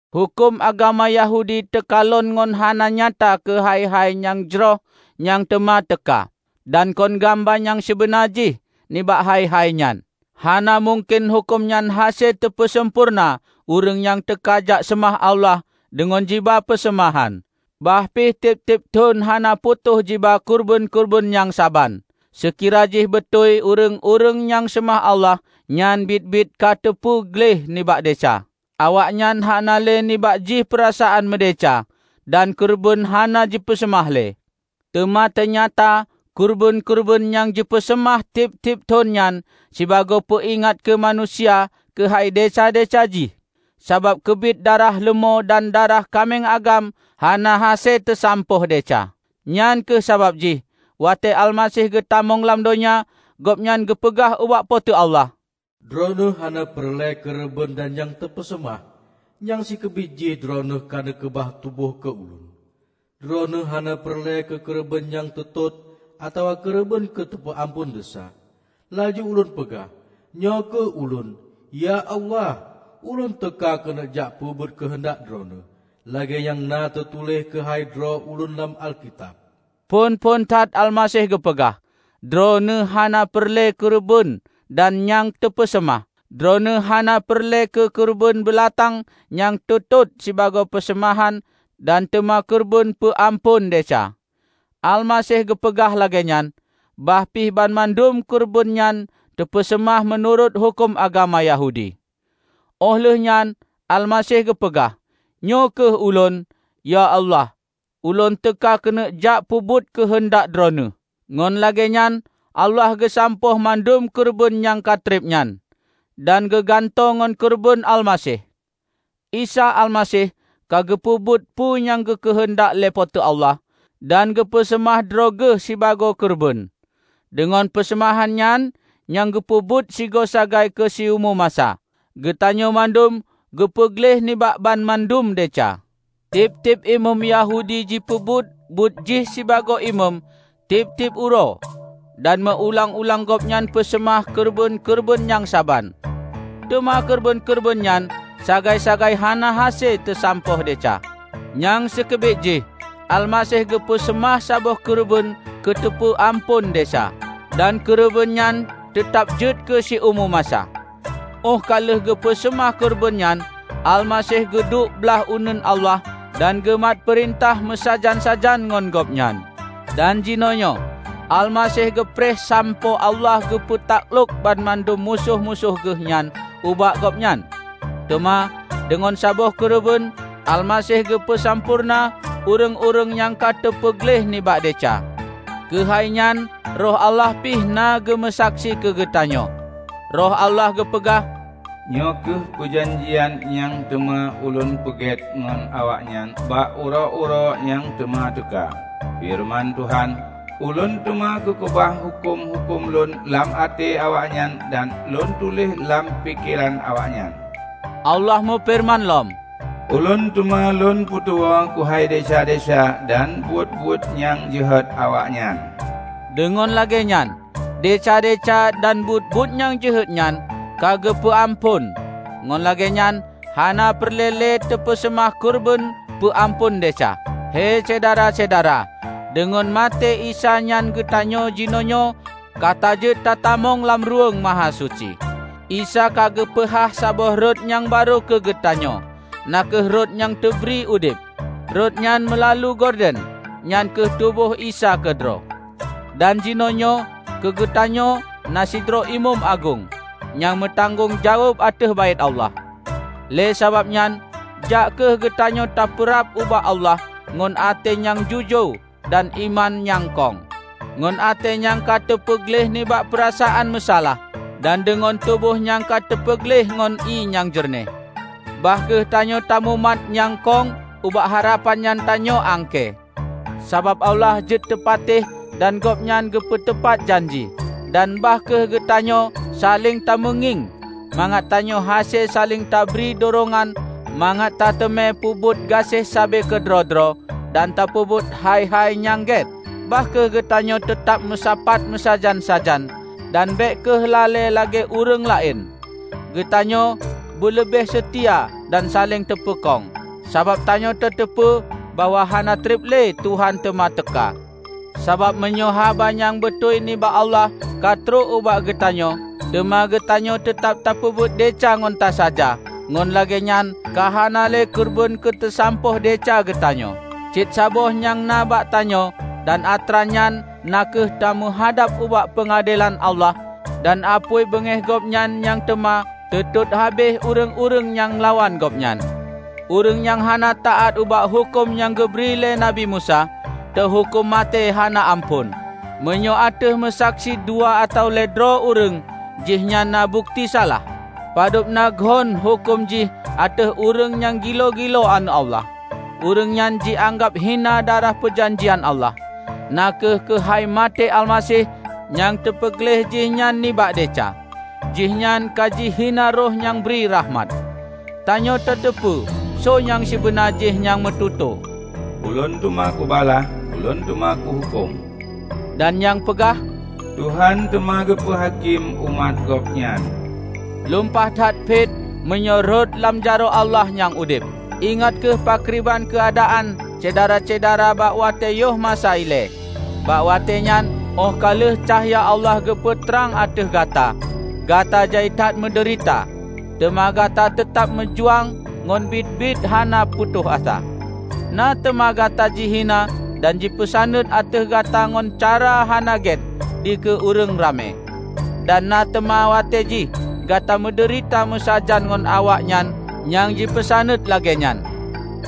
Huköm agama Yahudi teukalon ngon hana nyata keu hai-hai nyang jroh nyang teuma teuka, dan kon gamba nyang sibeuna jih nibak hai-hai nyan. Hana mungken huköm nyan hase teupeusampoereuna ureuëng nyang teuka jak seumah Allah deungon jiba peuseumahan, bah pih tieb-tieb thon hana putôh jiba keureubeuen-keureubeuen nyang saban. Seukira jih beutôi ureuëng-ureuëng nyang seumah Allah nyan biet-biet ka teupeu gleh nibak desya, awaknyan hana lé nibak jih peurasaan meudesya, dan keureubeuen hana jipeuseumah lé. Teuma teunyata keureubeuen-keureubeuen nyang jipeuseumah tieb-tieb thon nyan sibagoe peuingat keu manusia keuhai desya-desya jih, sabab keubiet darah leumô dan darah kaméng agam hana hase teusampôh desya. Nyang kheueh sabab jih watée Almaseh geutamong lam donya, Gobnyan geupeugah ubak Po teu Allah, "Droeneueh hana peureulée keureubeuen dan nyang teupeuseumah; nyang sikeubiet jih Droeneueh ka neukeubah tuboh keu Ulôn. Droeneueh hana peureulée keu keureubeuen nyang teutot atawa keureubeuen keu teupeu amphon desya. Laju Ulôn peugah, 'Nyoe kheueh Ulôn, ya Allah! Ulôn teuka keuneuk jak peubuet keuheundak Droeneueh, lagée nyang na teutuléh keuhai droe Ulôn lam Alkitab.' " Phon-phon that Almaseh geupeugah, "Droeneueh hana peureulée keureubeuen dan nyang teupeuseumah; Droeneueh hana peureulée keu keureubeuen beulatang nyang teutot sibagoe peuseumahan dan teuma keureubeuen peu amphon desya." Almaseh geupeugah lagée nyan, bah pih banmandum keureubeuen nyan teupeuseumah meunurot huköm agama Yahudi. Óh lheueh nyan Almaseh geupeugah, "Nyoe kheueh Ulôn, ya Allah! Ulôn teuka keuneuk jak peubuet keuheundak Droeneueh." Ngon lagée nyan Allah geusampôh mandum keureubeuen nyang ka treb nyan, dan geugantoe ngon keureubeuen Almaseh. Isa Almaseh ka geupeubuet peue nyang geukeuheundak lé Po teu Allah dan geupeu seumah droe Geuh sibagoe keureubeuen. Deungon peuseumahan nyan, nyang geupeubuet sigoe sagai keu siumu masa, geutanyoe mandum geupeu gleh nibak banmandum desya. Tieb-tieb imeum Yahudi jipeubuet buet jih sibagoe imeum tieb-tieb uroe, dan meu ulang-ulang gobnyan peuseumah keureubeuen-keureubeuen nyang saban. Teuma keureubeuen-keureubeuen nyan sagai-sagai hana hase teusampôh desya. Nyang sikeubiet jih, Almaseh geupeu seumah saboh keureubeuen keu teupeu amphon desya, dan keureubeuen nyan teutab jeuet keu siumu masa. Óh ka lheueh geupeu seumah keureubeuen nyan, Almaseh geuduek blaih uneuen Allah dan geumat peurintah meusajan-sajan ngon Gobnyan. Dan jinoenyoe Almaseh geupreh sampoe Allah geupeu taklok banmandum musoh-musoh Geuh nyan ubak Gobnyan. Teuma, deungon saboh keureubeuen, Almaseh geupeu sampoereuna ureuëng-ureuëng nyang ka teupeu gleh nibak desya. Keuhai nyan Roh Allah pi na geumeusaksi keugeutanyoe. Roh Allah geupeugah, " 'Nyoe kheueh peujanjian nyang teuma Ulôn peugét ngon awaknyan bak uroe-uroe nyang teuma teuka,' feureuman Tuhan, 'Ulôn teuma kukeubah huköm-huköm Lôn lam até awaknyan dan Lôn tuléh lam pikeran awaknyan.' " Allah meufeureuman lom, "Ulôn teuma Lôn peutuwoe keuhai desya-desya dan buet-buet nyang jeuhet awaknyan." Deungon lagée nyan, desya-desya dan buet-buet nyang jeuhet nyan ka geupeu amphon, ngon lagée nyan hana peureulée lé teupeuseumah keureubeuen peu amphon desya. Hei Syedara-syedara, deungon maté Isa nyan geutanyoe jinoenyoe ka tajeuet ta tamong lam Ruweueng Mahasuci. Isa ka geupeuhah saboh rot nyang barô keugeutanyoe, na kheueh rot nyang teubri udeb. Rot nyan meulalu gorden, nyan kheueh tuboh Isa keudroe. Dan jinoenyoe keugeutanyoe na sidroe Imeum Agong, nyang meutanggong jaweueb ateueh Baét Allah. Lé sabab nyan, jak kheueh geutanyoe tapeurab ubak Allah ngon até nyang jujoe dan iman nyang kong; ngon até nyang ka teupeu gleh nibak peurasaan meusalah, dan deungon tuboh nyang ka teupeu gleh ngon ié nyang jeureunéh. Bah kheueh tanyoe tamumat nyang kong ubak harapan nyang tanyoe angkée, sabab Allah jeuet teupatéh dan Gobnyan geupeutupat janji. Dan bah kheueh geutanyoe saléng tameungieng, mangat tanyoe hase saléng tabri durongan mangat tateumé peubuet gaséh sabe keudroe-droe dan tapeubuet hai-hai nyang gét. Bah kheueh geutanyoe teutab tameusapat meusajan-sajan, dan bék kheueh lalée lagée ureuëng laén. Geutanyoe beuleubeh seutia dan saléng tapeukong, sabab tanyoe tateupeue bahwa hana treb lé Tuhan teuma teuka. Sabab meunyoe haba nyang beutôi nibak Allah ka trok ubak geutanyoe, teuma geutanyoe teutab tapeubuet desya ngon tasaja, ngon lagée nyan ka hana lé keureubeuen keuteusampôh desya geutanyoe. Cit saboh nyang na bak tanyoe dan atra nyan na kheueh tameuhadab ubak peungadelan Allah dan apui beungéh Gobnyan nyang teuma teutot habéh ureuëng-ureuëng nyang lawan Gobnyan! Ureuëng nyang hana taát ubak huköm nyang geubri lé Nabi Musa, teuhuköm maté hana amphon, meunyoe ateueh meusaksi dua atawa lhée droe ureuëng, jihnyan na bukeuti salah. Padub na geuhon huköm jih ateueh ureuëng nyang gilo-gilo Aneuëk Allah. Ureuëng nyan jianggab hina darah peujanjian Allah, na kheueh keuhai maté Almaseh nyang teupeu gleh jih nyan nibak desya. Jihnyan ka jihina Roh nyang bri rakhmat. Tanyoe tateupeue soe nyang sibeuna jih nyang meututoe, "Ulôn teuma kubalah! Ulôn teuma kuhuköm!" dan nyang peugah, "Tuhan teuma geupeu hakém umat Gobnyan." Lumpah that phet meunyoe rhot lam jaroe Allah Nyang Udeb! Ingat kheueh pakriban keuadaan Syedara-syedara bak watée yoh masa ilée. Bak watée nyan, óh ka lheueh cahya Allah geupeue trang ateueh gata, gata jai that meudeurita; teuma gata teutab meujuang ngon biet-biet hana putôh asa. Na teuma gata jihina dan jipeusaneuet ateueh gata ngon cara hana gét dikeue ureuëng ramé. Dan na teuma watée jih gata meudeurita meusajan ngon awaknyan nyang jipeusaneuet lagée nyan,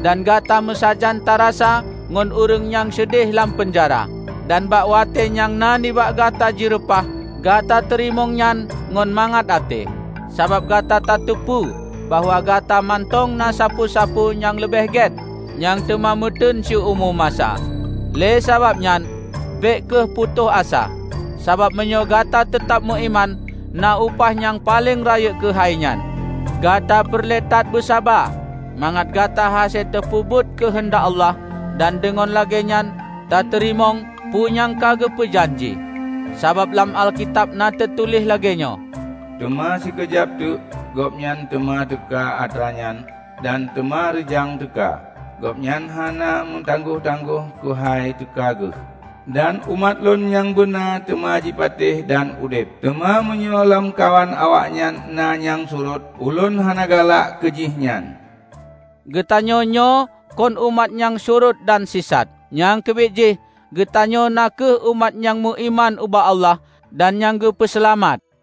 dan gata meusajan tarasa ngon ureuëng nyang seudeh lam peunjara. Dan bak watée nyang na nibak gata jireupah, gata teurimong nyan ngon mangat até, sabab gata tateupeue bahwa gata mantong na sapeue-sapeue nyang leubeh gét, nyang teuma meuteun siumu masa. Lé sabab nyan, bék kheueh putôh asa, sabab meunyoe gata teutab meuiman, na upah nyang paleng rayeuk keuhai nyan! Gata peureulée that beusaba, mangat gata hase tapeubuet keuheundak Allah dan deungon lagée nyan tateurimong peue nyang ka geupeu janji. Sabab lam Alkitab na teutuléh lagée nyoe, "Teuma sikeujab teuk, Gobnyan teuma teuka atra nyan, dan teuma reujang teuka; Gobnyan hana meutanggoh-tanggoh keuhai teuka Geuh. Dan umat Lôn nyang beuna teuma jipatéh dan udeb; teuma meunyoe lamkawan awaknyan na nyang surot, Ulôn hana galak keu jih nyan." Geutanyoe nyoe kon umat nyang surot dan sisat. Nyang keubiet jih, geutanyoe na kheueh umat nyang meuiman ubak Allah dan nyang geupeu seulamat.